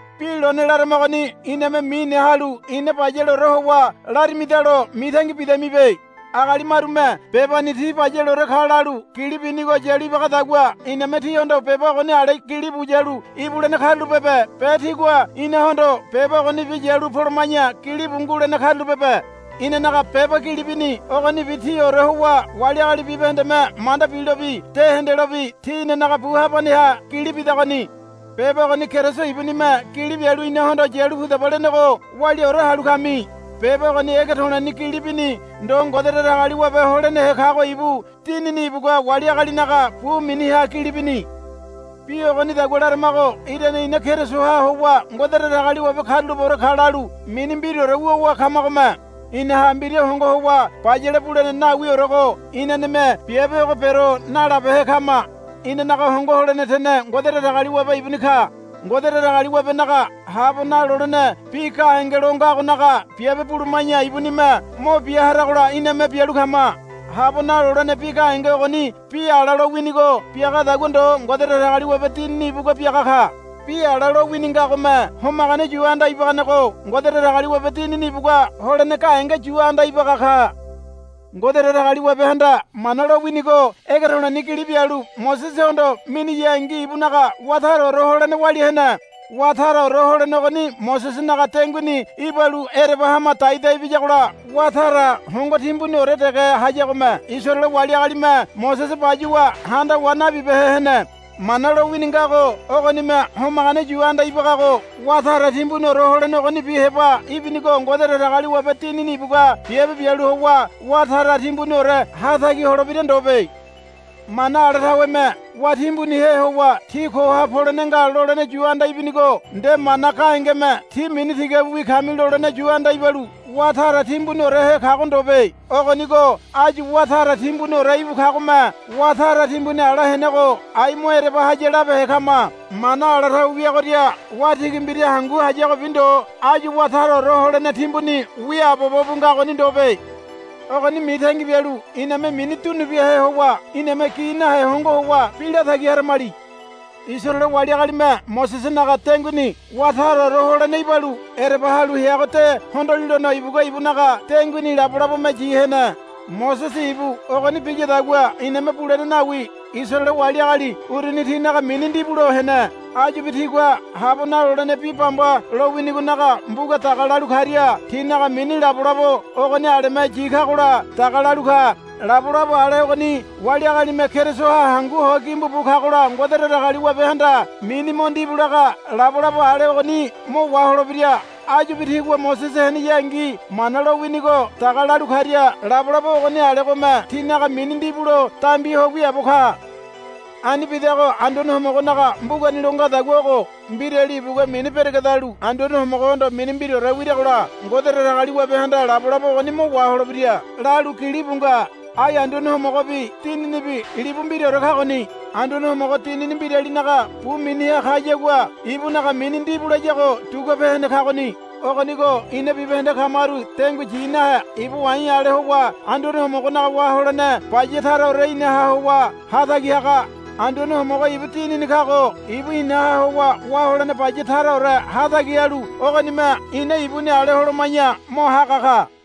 Bi lone laramagoni iname mine halu ina bayaleore howa larimadalo mitangi bidamibe. Agali marume bebani ti bayaleore ka lalu gili binigo yalu ibagadagua iname tíhondo beba ogoni ale gilibu yalu ibulene karulapebe be tígua inahondo beba ogonibi yalu poloma̱ya gilibu ngulene karulapebe. Inanaga beba gili bini ogonibi tíore howa wali agali bibahendeme manda bilobi de hendelobi tí inanaga bu habaneha gili bidagoni. Beba ogoni Keriso ibunime gili bialu inahondo, Yalu pudaba, lenego waliaore halu kami. Beba ogoni ege to̱le̱ni gili bini ndo Ngode Datagaliwabe holenehe kago ibu Dinini ibugua wali agalinaga bu miniha gili bini. Bi ogonidagua laramago irane ina Kerisoha howa Ngode Datagaliwabe karulapeore ka lalu mini mbiraore wuwa kamagome. Inaha mbira hongo howa bayale bulene nawiorego inaneme biabe ogo bero nalabehe kama. Inanaga hongo holene tene Ngode Datagaliwabe ibuni ka. Ngode Datagaliwabenaga habo nalolene bi gahenge lo ngagonaga biabe buluma̱ya ibunime mo bia haragola iname bialu kama. Habo nalolene bi gahenge ogoni bi ala lowinigo biagadagua ndo Ngode Datagaliwabe Dinini ibugua biaga ka. Bi ala lowini ngagome homagane yu anda ibaganego Ngode Datagaliwabe Dinini ibugua holene gahenge yu anda ibaga ka. Ngode Datagaliwabehanda Mana lo winigo ege to̱le̱ni gili bialu Mosesehondo miniyangi ibunaga wá taraore holene walia hene. Wá taraore holene ogoni Mosesenaga denguini ibalu ereba hama daidai biyagola wá tara hongo timbuniore dege hayagome Isaraele wali agalime Mosese bayuwa handawa nabibehe hene. Mana lowini ngago ogonime homagane yu anda ibagago wá tara timbuniore holene ogonibi heba ibinigo Ngode Datagaliwabe Dinini ibugua biabe bialu howa wá tara timbuniore hatagi holebira ndobe. Mana ala taweme wá timbunihe howa, Tí koha polene nga, lolene yu anda ibinigo nde mana gahengeme, Tí mini tigabiwi kami, lolene yu anda ibalu wá tara timbuniorehe kago ndobe. Ogonigo áyu wá tara timbuniore íbu kagome wá tara timbuni ala henego ai mo ereba haya labehe kama. Mana ala tawe wiagoria wá tigi mbira hangu hayagobi ndo áyu wá taraore holene timbuni wiaabobo bu ngagoni ndobe. Ogoni mitangi bialu iname mini dunubiahe howa iname gi nahe hongo howa bi latagi haramali. Isaraele wali agalime Mosesenaga denguini wá taraore holene ibalu ereba halu heago de hondolilono ibugua ibunaga denguini labolabome yi hene. Mosese ibu ogoni biyadagua iname bulene nawi. Isaraele wali agali uruni tinaga mini ndibulo hene. Áyubi tigua habo nalolene bi bamba lo winigonaga mbuga daga lalu karia tinaga mini labolabo ogoni aleme yi kagola daga lalu ka. Labolabo ale ogoni wali agalime Kerisoha hangu ho gimbu bu kagola Ngode Datagaliwabehanda mini mo ndibu laga labolabo ale ogoni mo waholebira. Áyubi tigua Mosese heneyangi Mana lowinigo daga lalu karia labolabo ogoni alegome tinaga mini ndibulo dambi ho wiaabo ka. Ani bidago Anduane Homogonaga mbugani lo ngadagua ogo, Mbirali ibugua mini beregedalu Anduane Homogohondo mini mbiraore wiragola Ngode Datagaliwabehanda labolabo ogoni mo waholebira, lalu gilibu nga. Ai Anduane Homogobi Dininibi libu mbiraore kagoni. Anduane Homogo Dinini mbiralinaga bu miniha kayagua ibunaga mini ndibu layago duguape hene kagoni. Ogonigo ina bibahende kamaru dengui yi nahe iba wa̱i̱ ale howa Anduane Homogonaga wá holene baya taraore inaha howa hatagi haga. Anduane Homogo ibu Dinini kago ibu inaha howa wá holene baya taraore hatagi halu ogonime ina ibuni ale holoma̱ya mo haga ka.